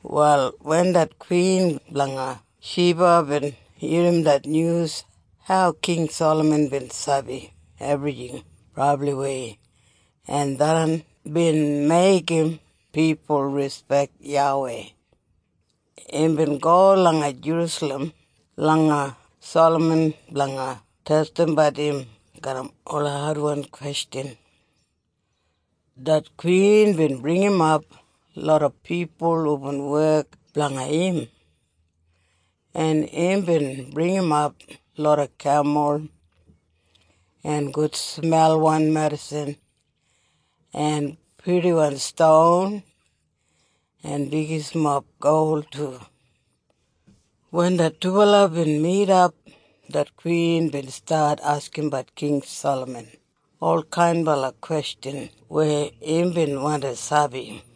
Wal wen det kwin blanga Shiba bin irrim det nyus hau King Salaman bin sabi ebrijing brabliwei en tharran bin meigim pipul rispek YAWEI, imbin go langa Jerusalem langa Salaman blanga testimbat im garram ola adwan kwestjan. Det kwin bin bringimap loda pipul hubin wek blanga im, en imbin bringimap loda kemul, en gudsmelwan medisin, en purdiwan ston, en bigismob gol du. Wen det dubala bin midap, det kwin bin stat askimbat King Salaman ol kainbala kwestjan weya imbin wandi sabi.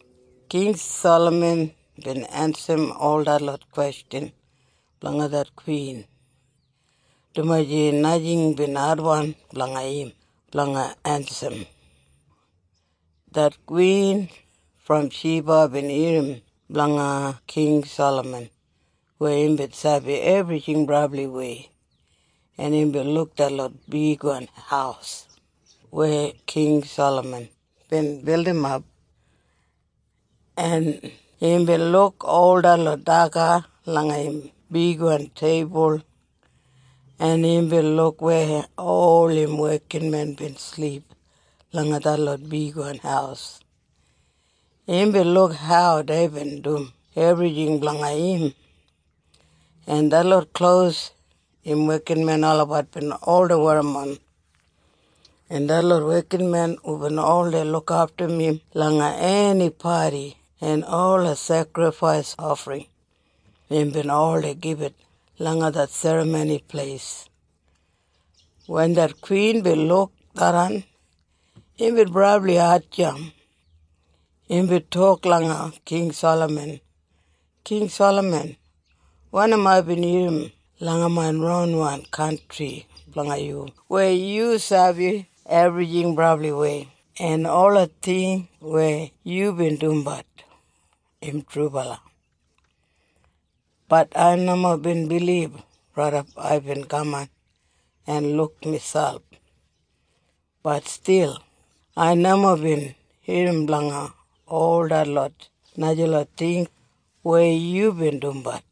King Salaman bin ensim ol detlot kwestjan blanga det kwin, dumaji najing bin adwan blanga im blanga ensim. Det kwin brom Shiba bin irrim blanga King Salaman weya imbin sabi ebrijing brabliwei, en imbin luk detlot bigwan haus weya King Salaman bin bildimap. En imbin luk ol detlot daga langa im bigwan teibul, en imbin luk weya ol im wekinmen bin silip langa detlot bigwan haus. Imbin luk hau deibin dum ebrijing blanga im, en detlot klos im wekinmen olabat bin oldei werrimon, en detlot wekinmen hubin oldei lukaftum im langa eni padi en ola sekrifais ofring imbin oldei gibit langa det Serramoni Pleis. Wen det kwin bin luk tharran imbin brabli hatjamp. Imbin tok langa King Salaman, “King Salaman, wanim aibin irrim langa main ronwan kantri blanga yu weya yu sabi ebrijing brabliwei en ola ting weya yubin dumbat, im trubala. Bat ai nomo bin bilib raidap aibin kaman en luk miselp. Bat stil ai nomo bin irrim blanga ol detlot najalot ting weya yubin dumbat.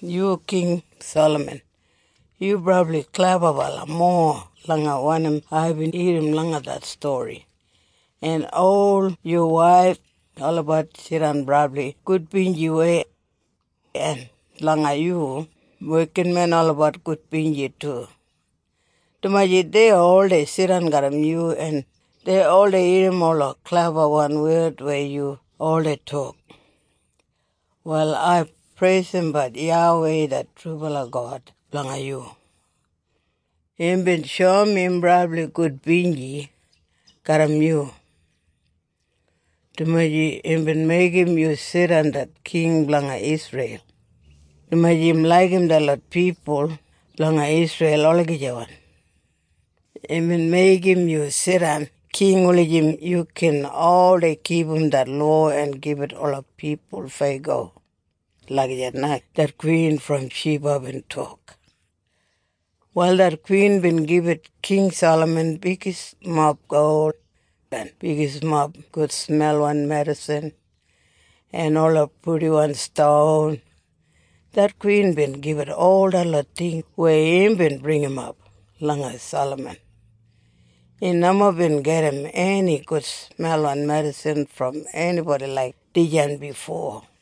Yu King Salaman, yu brabli klebabala mowa langa wanim aibin irrim langa det stori. En ol yu waif, olabat jidan brabli gudbinjiwei. En blanga yu wekinmen olabat gudbinji du, dumaji dei oldei jidan garram yu en dei oldei irrim ola klebawan wed weya yu oldei tok. Wal ai preisimbat YAWEI det trubala God blanga yu. Imbin shoum im brabli gudbinji garram yu, dumaji imbin meigim yu jidan det king blanga Isreil. Dumaji im laigim detlot pipul blanga Isreil olagijawan, imbin meigim yu jidan king wulijim yu gin oldei kipum det lowa en gibit ola pipul feyago.” Lagijat na det kwin brom Shiba bin tok. Wal det kwin bin gibit King Salaman bigismob gol, en bigismob gudsmelwan medisin, en ola purdiwan ston. Det kwin bin gibit ol detlot ting weya imbin bringimap langa Salaman. Im nomo bin gedim eni gudsmelwan medisin brom enibodi laik dijan bifo.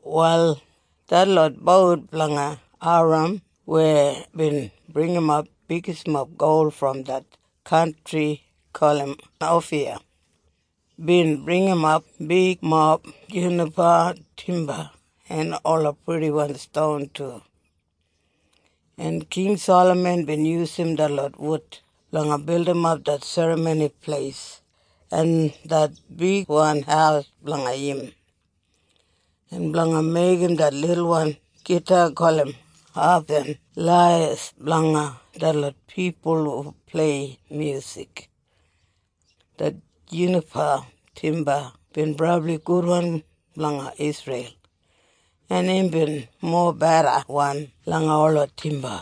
Wal detlot bout blanga Hairam weya bin bringimap bigismob gol brom det kantri gulum Ofiya, bin bringimap bigmob junipa timba en ola purdiwan ston du. En King Salaman bin yusum detlot wud blanga bildimap det Serramoni Pleis en det bigwan haus blanga im, en blanga meigim det lilwan gita gulum hap en laiyas blanga detlot pipul hu plei myusik. Det junipa timba bin brabli gudwan langa Isreil en imbin mobedawan langa ola timba.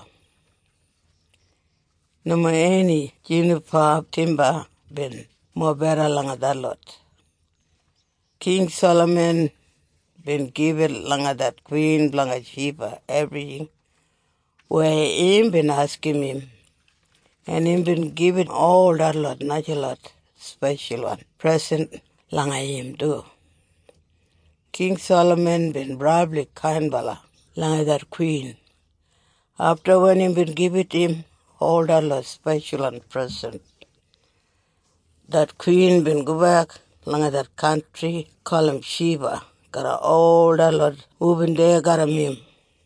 Nomo eni junipa timba bin mobeda langa detlot. King Salaman bin gibit langa det kwin blanga Shiba ebrijing weya imbin askim im, en imbin gibit ol detlot najalot speshalwan presen langa im du. King Salaman bin brabli kainbala langa det kwin. Afta wen imbin gibit im ol detlot speshalwan presen, det kwin bin gobek langa det kantri gulum Shiba garram ol detlot hubin deya garram im.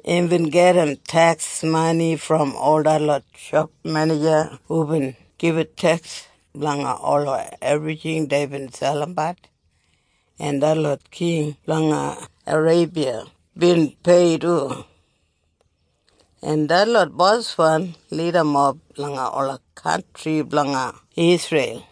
Imbin gedim teks mani brom ol detlot shop menija hubin gibit teks blanga ola ebrijing deibin selimbat, en detlot king blanga Areibiya bin pei du, en detlot boswan lidamob langa ola kantri blanga Isreil.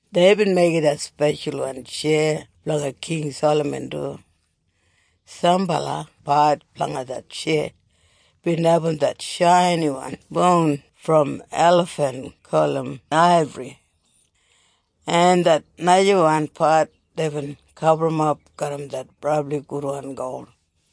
Deibin meigim det speshalwan tjeya blanga King Salaman du. Sambala pat blanga det tjeya bin abum det shainiwan boun brom elafen gulum aibri, en det najawan pat deibin gaburrumap garram det brabli gudwan gol.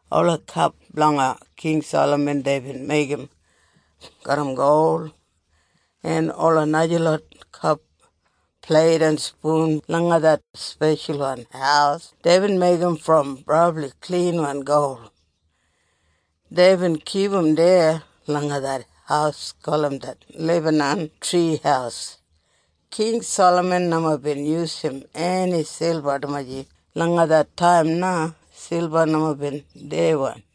Ola kap blanga King Salaman deibin meigim garram gol, en ola najalot kap, pleit en spun langa det speshalwan haus deibin meigim brom brabli klinwan gol. Deibin kipum deya langa det haus gulum Det Lebanan Tri Haus. King Salaman nomo bin yusum eni silba dumaji langa det taim na silba nomo bin diyawan.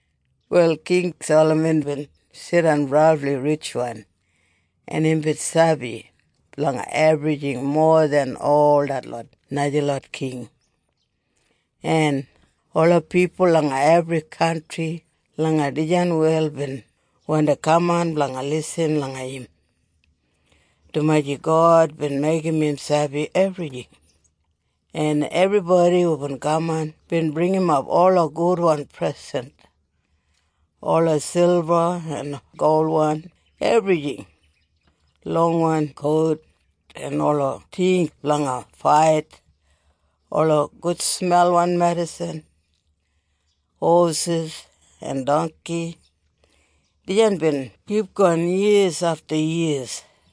Wal King Salaman bin jidan brabli ritjwan, en imbin sabi blanga ebrijing mowa den ol detlot najalot king. En ola pipul langa ebri kantri langa dijan wel bin wandi kaman blanga lisin langa im, dumaji God bin meigim im sabi ebrijing. En ebribodi hubin kaman bin bringimap ola gudwan presen, ola silba en golwan ebrijing, longwan kot, en ola ting blanga fait, ola gudsmelwan medisin, hosis en dongki. Dijan bin kipgon yiya afta yiya.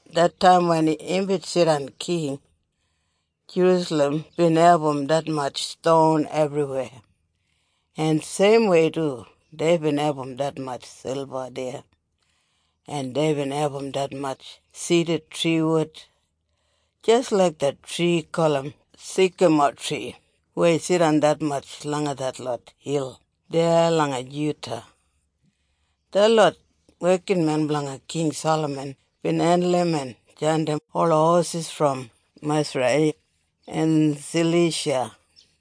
Det taim wen imbin jidan king, Jerusalem bin abum detmatj ston ebriweya, en seimwei du deibin abum detmatj silba deya. En deibin abum detmatj sidatri wud, jis laik det tri gulum sikamotri weya jidan detmatj langa detlot hil deya langa Juda. Detlot wekinmen blanga King Salaman bin hendulum en jandim ola hosis brom Musrai en Salisha,